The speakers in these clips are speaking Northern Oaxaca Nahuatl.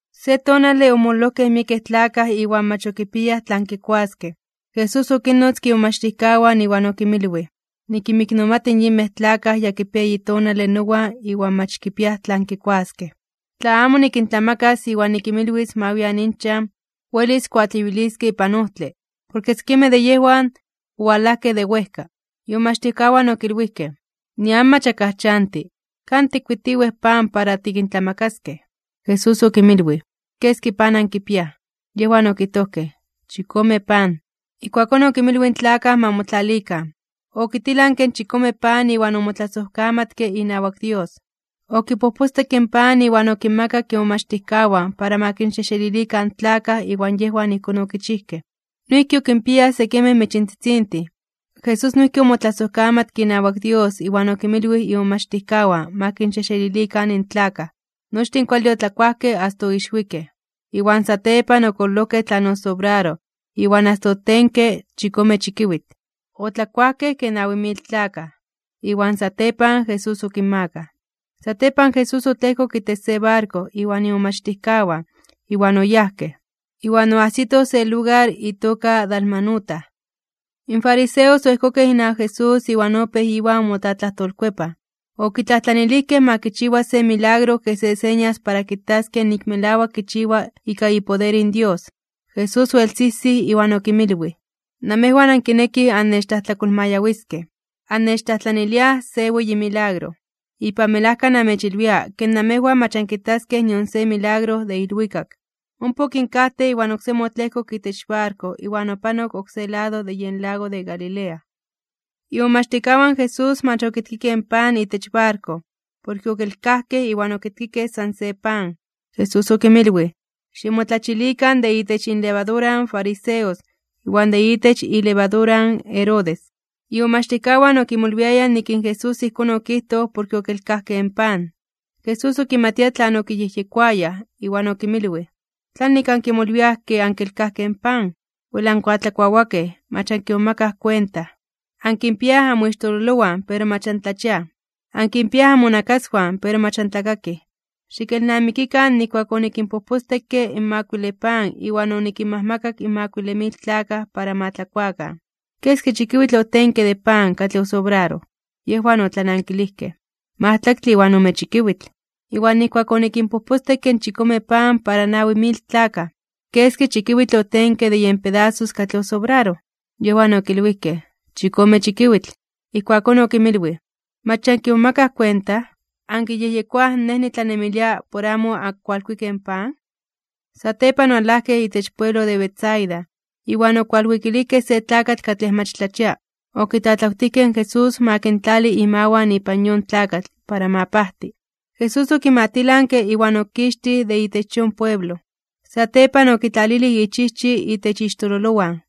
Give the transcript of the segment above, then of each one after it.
Se tonale omololojkej miekej tlakaj iwan mach okipiayaj tlan kikuaskej, Jesús okinnotzke imomachtijkawan iwan okinmilwij: ―Nikinmiknomati in yinmej tlakaj ya kipiaj eyi tonale nowan iwan mach kipiaj tlan kikuaskej. Tla amo nikintlamakas iwan nikinmilwis ma wian inchan, welis kuatleyuiliskej ipan ojtle, porke sekimej de yejwan owalajkej de wejka. Imomachtijkawan okilwijkej: ―Nian mach akaj chanti, ¿kan tikkuitiwej pan para tikintlamakaskej? Jesús okinmilwij: ―¿Keski pan ankipiaj? Yejwan okijtojkej: ―Chikome pan. Ijkuakón okinmilwij in tlakaj ma motlalikan. Okitilanke in chikome pan iwan omotlasojkamatke inawak Dios, okipojpostekke in pan iwan okinmakak imomachtijkawan para ma kinxejxelilikan in tlakaj iwan yejwan ijkón okichijkej. Noijki okinpiayaj sekimej michintzitzintin. Jesús noijki omotlasojkamatke inawak Dios iwan okinmilwij imomachtijkawan ma kinxejxelilikan in tlakaj. Nochtin kuale otlakuajkej asta oixwikej. Iwan satepan okololojkej tlan osobraroj iwan asta otenke chikome chikiwitl. Otlakuajkej kej nawi mil tlakaj. Iwan satepan Jesús okinmakaj. Satepan Jesús otlejkok itech se barko iwan imomachtijkawan iwan oyajkej. Iwan oajsitoj se lugar itoka Dalmanuta. In fariseos oejkokej inawak Jesús iwan opéj Iwan motlatlajtolkuepaj. Okitlajtlanilijkej ma kichiwa se milagro kej se señas para kitaskej nik melawak kichiwa ika ipoder in Dios. Jesús oelsijsij iwan okinmilwij: ―Namejwan ankinekij annechtlajtlakolmayawiskej, annechtlajtlaniliaj se weyi milagro. Ipan melajka namechilwia ke namejwan mach ankitaskej nion se milagro de ilwikak. Ompa okinkajtej iwan oksemi otlejkok itech barko iwan opanok oksé lado de yen lago de Galilea. Imomachtijkawan in Jesús mach okitkikej pan itech barko, porke okelkajkej iwan okitkikej san se pan. Jesús okinmilwij: ―Ximotlachilikan de itech inlevadura in fariseos iwan de itech ilevadura in Herodes. Imomachtijkawan opéj kimolwiaj se iwan oksé: ―Ijkón techilwia porke otikelkajkej in pan. Jesús okimatia tlan okiyejyekoayaj iwan okinmilwij: ―¿Tlanik ankimolwiaj ke ankelkajkej in pan? Wel ankuatlakuawakej, mach ankimomakaj kuenta. Ankipiaj anmixtololowan pero mach antlachiaj. Ankipiaj anmonakaswan pero mach antlakakij. Xikelnamikikan nijkuak onikinpojpostekke in makuile pan iwan onikinmajmakak makuile mil tlakaj para ma tlakuakan. ¿Keski chikiwitl otenke de pan katlej osobraroj? Yejwan otlanankilijkej: ―Majtlaktle iwan ome chikiwitl. ―Iwan nijkuak onikinpojpostekke in chikome pan para nawi mil tlakaj, ¿keski chikiwitl otenke de yen pedasos katlej osobraroj? Yejwan okilwijkej: ―Chikome chikiwitl. Ijkuakón okinmilwij: ―¿Mach ya ankimomakaj kuenta? ¿Ankiyejyekoaj Nej nitlanemilia por amo ankualkuikej in pan? Satepan owalajkej itech pueblo de Betsaida, iwan okualwikilijkej se tlakatl katlej mach tlachia, okitlatlawtijkej in Jesús ma kintlali imawan ipan yon tlakatl para ma pajti. Jesús okimatilanke iwan okixtij de itech yon pueblo. Satepan okitlalilij ichijchi itech ixtololowan,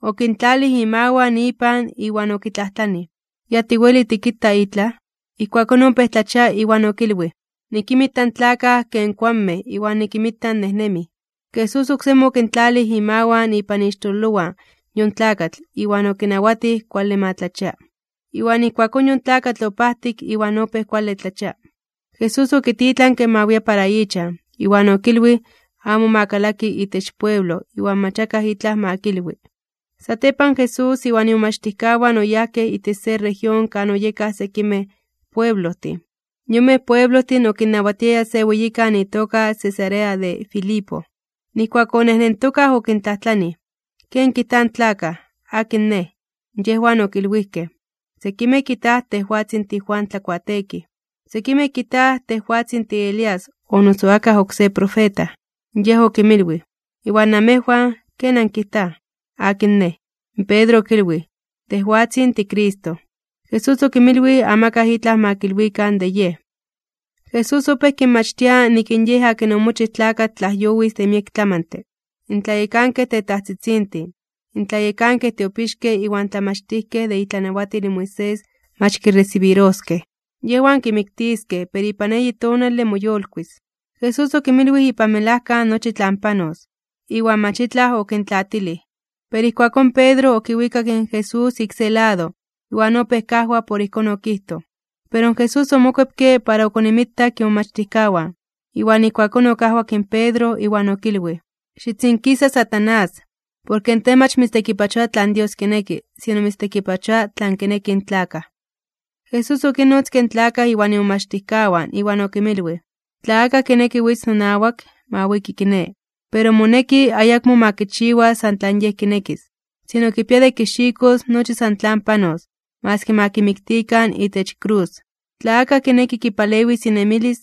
okintlalij imawan ipan iwan okitlajtlanij kox ya weli itlaj kita. Ijkuakón opéj tlachia iwan okilwij: ―Nikinmita in tlakaj kej kuanmej iwan nikinmita nejnemij. Jesús oksemi okintlalij imawan ipan ixtololowan yon tlakatl iwan okinawatij kuale ma tlachia. Iwan ijkuakón yon tlakatl opajtik iwan opéj kuale tlachia. Ijkuakón Jesús okititlanke ma wia para ichan, iwan okilwij: ―Amo xikalaki itech pueblo iwan amo akaj itlaj xikilwi. Satepan Jesús iwan imomachtijkawan oyajkej itech se región kan oyekaj sekimej pueblojtin. Yonmej pueblojtin okinnawatiaya se weyikan itoka Cesarea de Filipo. Nijkuak onejnentokaj okintlajtlanij: ―¿Ken kijtaj in tlakaj? ¿Akin Nej? Yejwan okilwijkej: ―Sekimej kijtaj tejwatzin tiJuan Tlakuateekij, sekimej kijtaj tejwatzin tiElías o noso akaj oksé profeta. Yej okinmilwij: ―Iwan namejwan, ¿ken ankijtaj? ¿Akin Nej? Pedro okilwij: ―Tejwatzin tiCristo. Jesús okinmilwij amakaj itlaj ma kilwikan de Yej. Jesús opéj kinmachtia nik in Yej akin omochij tlakatl tlajyowis de miek tlamantle. In tlayekankej tetajtzitzintin, in tlayekankej tiopixkej iwan in tlamachtijkej de itlanawatil in Moisés mach kiresibiroskej. Yejwan kimiktiskej pero ipan eyi tonale moyolkuis (moyolitis). Jesús okinmilwij ipan melajka nochi tlan panos, iwan mach itlaj okintlaatilij. Pero ijkuakón Pedro okiwikak in Jesús ik se lado, iwan opéj kajwa por ijkón okijtoj. Pero Jesús omokuepke para okonimitak imomachtijkawan, iwan ijkuakón okajwak in Pedro iwan okilwij: ―¡Xitzinkisa, Satanás! Porke tej mach mitztekipachoa tlan Dios kineki, sino mitztekipachoa tlan kinekij in tlakaj. Jesús okinnotzke in tlakaj iwan imomachtijkawan iwan okinmilwij: ―Tla akaj kineki witz nonawak, ma wiki kiné, pero moneki ayakmo ma kichiwa san tlan yej kinekis. Sino kipia de kixikos nochi san tlan panos, maski ma kimiktikan itech krus. Tla akaj kineki kipalewis inemilis,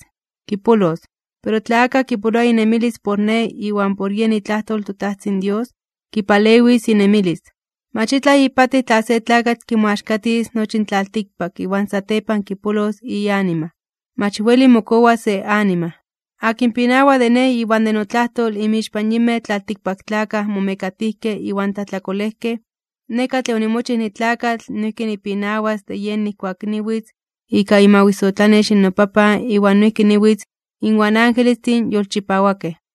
kipolos, pero tla akaj kipoloa inemilis por Nej iwan por yen itlajtol in toTajtzin Dios, kipalewis inemilis. Mach itlaj ipatij tla se tlakatl kimoaxkatis nochi in tlaltikpak iwan satepan kipolos ianima. Mach weli mokowa se anima. Akin pinawa de Nej iwan de notlajtol inmixpan yinmej tlaltikpaktlakaj momekatijkej iwan tlajtlakolejkej, Nej katlej onimochij nitlakatl noijki nipinawas de yej nijkuak niwitz ika imawisotlanex in noPapan iwan noijki niwitz inwan angelestin yolchipawakej.